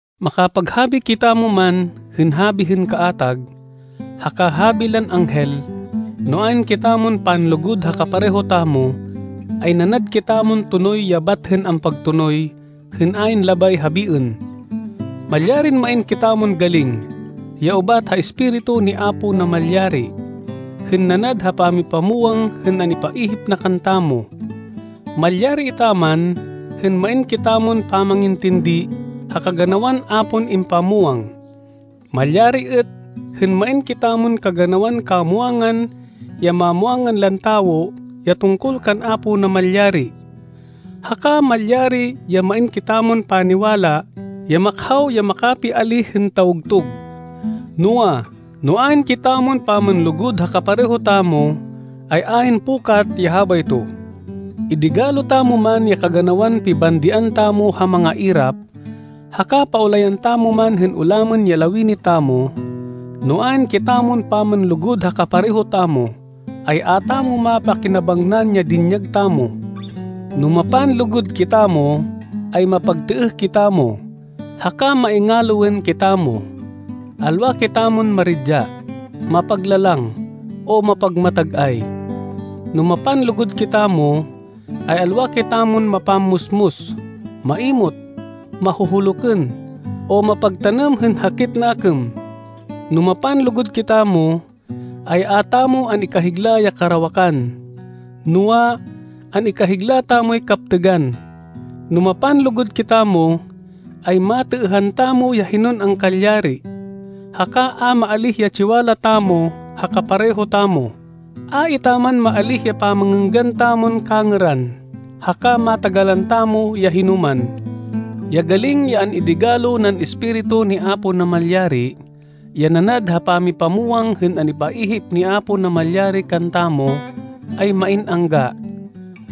Makapaghabi kitamo man hên habi hên kaatag, haka habi lan anghel, no ayn kitamon panlugud ha kapareho tamo, ay nanad kitamon tonoy ya bat hên ampagtonoy hên ayn labay habiên. Malyarin main kitamon galing, ya ubat ha Espiritu ni Apo Namalyari, hên nanad ha pamipamwang hên an-ipaihip na kantamo. Malyari etaman hên main kitamon pamangintindi ha kaganawan a pon impamwang. Malyari êt hên main kitamon kaganawan kamwangan ya mamwangan lan tawo ya tungkol kan Apo Namalyari. Haka malyari ya main kitamon paniwala ya makhaw ya makapiálih hên tawgtug. Noa, no ayn kitamon pamanlugud ha kapareho tamo, ay ayn pukat ya habayto. Idigalo tamo man ya kaganawan pibandian tamo ha mangairap, haka paulayan tamo man hên ulamên ya lawini tamo, no ayn kitamon pamanlugud ha kapareho tamo, ay a tamo mapakinabangnan ya dinyag tamo. No mapanlugud kitamo, ay mapagtêêh kitamo, haka maingaloên kitamo. Alwa kitamo maridya, mapaglalang, o mapagmatag-ay. No mapanlugud kitamo, ay alwa kitamon mapammusmus, maimot, mahuhulukên, o mapagtanêm hên hakit nakêm. No mapanlugud kitamo, ay a tamo an-ikahigla ya karawakan. Noa, an-ikahigla tamoy kaptêgan. No mapanlugud kitamo, ay matêêhan tamo ya hinon angkalyari, haka a maalíh ya tsiwala tamo ha kapareho tamo, a etaman maalíh ya pamangênggan tamon kangêran, haka matagalan tamo ya hinoman. Ya galing ya an-idigalo nan Espiritu ni Apo Namalyari, ya nanad ha pamipamwang hên an-ipaihip ni Apo Namalyari kantamo, ay main angga.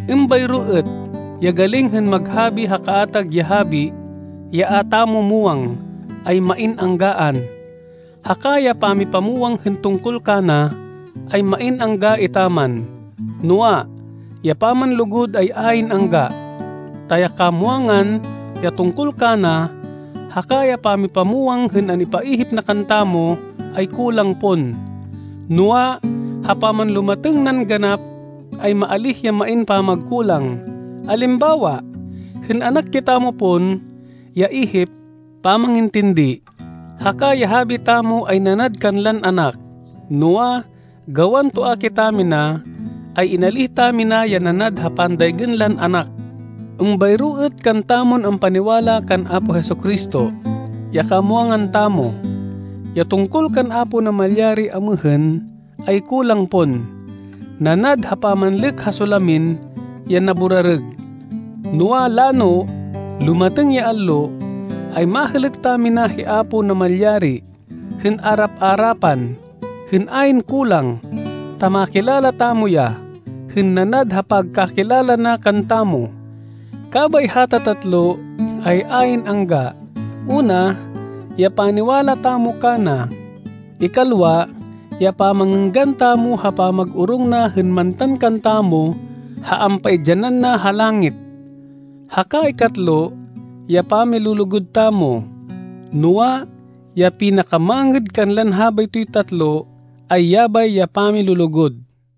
Êmbayro êt ya galing hên mag-habi ha kaatag ya habi, ya a tamo muwang, ay main anggaan. Haka ya pamipamwang hên tungkol kana, ay main angga etaman. Noa, ya pamanlugud ay ayn angga, ta ya kamwangan, ya tungkol kana, haka ya pamipamwang hên an-ipaihip na kantamo, ay kulang pon. Noa, ha pamanlumatêng nan ganap ay maalíh ya main pamagkulang. Alimbawa, hên anak kitamo pon, ya ihip, pamangintindi, haka ya habi tamo ay nanad kanlan anak. Noa, gawan toa kitamina, ay inalíh tamina ya nanad ha pandaygên lan anak. Êmbayro êt kantamon ampaniwala kan Apo Jesu-Cristo. Ya kamwangan tamo, ya tungkol kan Apo Namalyari amêhên, ay kulang pon, nanad ha pamanlêk ha solamin ya naburarêg. Noa, lano, lumatêng ya allo, ay mahêlêk tamina hi Apo Namalyari, hên arap-arapan, hên ayn kulang, ta makilala tamo ya, hên nanad ha pagkakilala na kantamo. Kabay hata tatlo ay ayn angga. Una, ya paniwala tamo kana, ikalwa ya pamangênggan tamo ha pamag-orong na hên mantan kantamo ha ampaidyanan na ha langit, haka ikatlo, ya pamilulugud tamo. Noa, ya pinakamangêd kanlan habaytoy tatlo ay yabay ya pamilulugud.